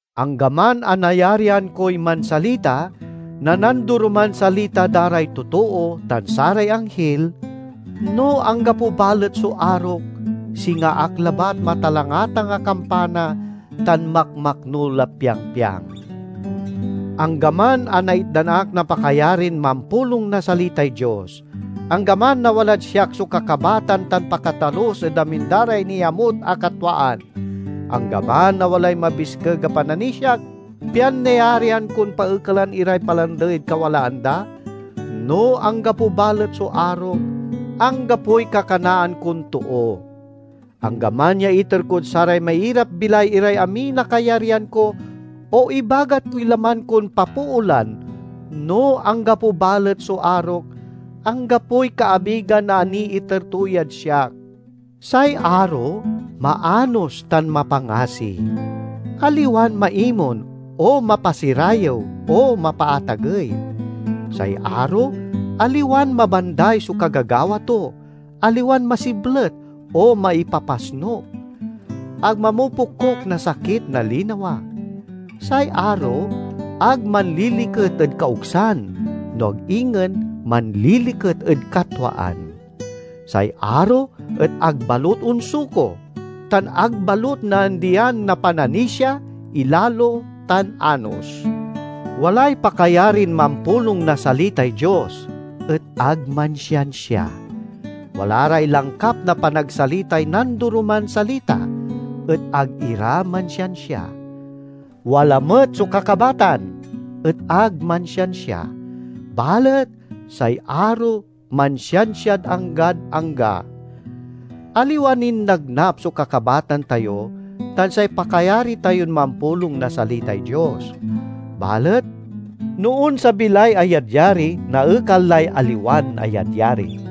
Anggaman a nayarian koy mansalita na nandoroman salita da ray totoo tan saray anghil, no anggapo balet so arok, singa ak labat matalangatang a kampana tan makmaknul a piangpiang. Anggaman a naitdan ak na pakayarin mampulong na salitay Dios; anggaman a walad siak so kakabatan tan pakatalus ed amin da ray niamut a katwaan; anggaman a walay mabiskeg a pananisiak pian nayarian kon paekalen iray palandey ed kawalaan da, no anggapo balet so arok, anggapoy kakanaan kon too. Anggaman ya iter kod saray mairapbilay iray amin a kayaryan ko, o ibagat koy laman kon papoolan, no anggapo balet so arok, anggapoy kaabigan a niiter to yad siak. Say aro maanos tan mapangasi; aliwan maimon, o mapasirayew, o mapaatagey; say aro aliwan mabanday so kagagawa to, aliwan masiblet, o maipapasnuk; ag mamopokuk na sakit na linawa. Say aro ag manliliket ed kaogsan, no ag ingen manliliket ed katwaan. Say aro et ag balut onsuko, tan ag balut naandian na pananisia, ilalo, tan anos. Walay pakayarin mampulong na salitay Dios, et ag mansiansia. Wala ray langkap na panagsalitay nandoroman salita, et ag ira mansiansia. Wala met so kakabatan, et ag mansiansia. Balet say aro mansiansiad anggad angga. Aliwa nin nagnap so kakabatan tayo tan say pakayari tayon mampulong na salitay Dios. Balet no onsabi lay ayadyari, naekal lay aliwan ayadyari.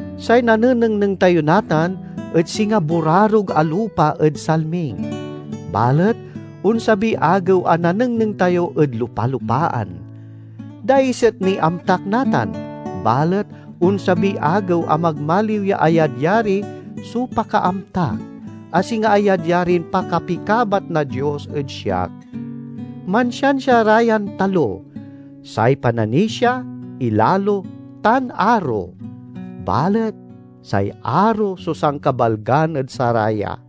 Say nanenengneng tayo natan et singa burarog a lupa ed salming; balet onsabiy agew a nanengneng tayo ed lupa-lupaan. Daiset niy amtak natan, balet onsabiy agew a magmaliw ya ayadyari so pakaamtak, a singa ayadyarin pakapikabat na Dios ed siak. Mansiansia ra yan talo: say pananisia, ilalo, tan aro; balet say aro so sankabalgan ed saraya.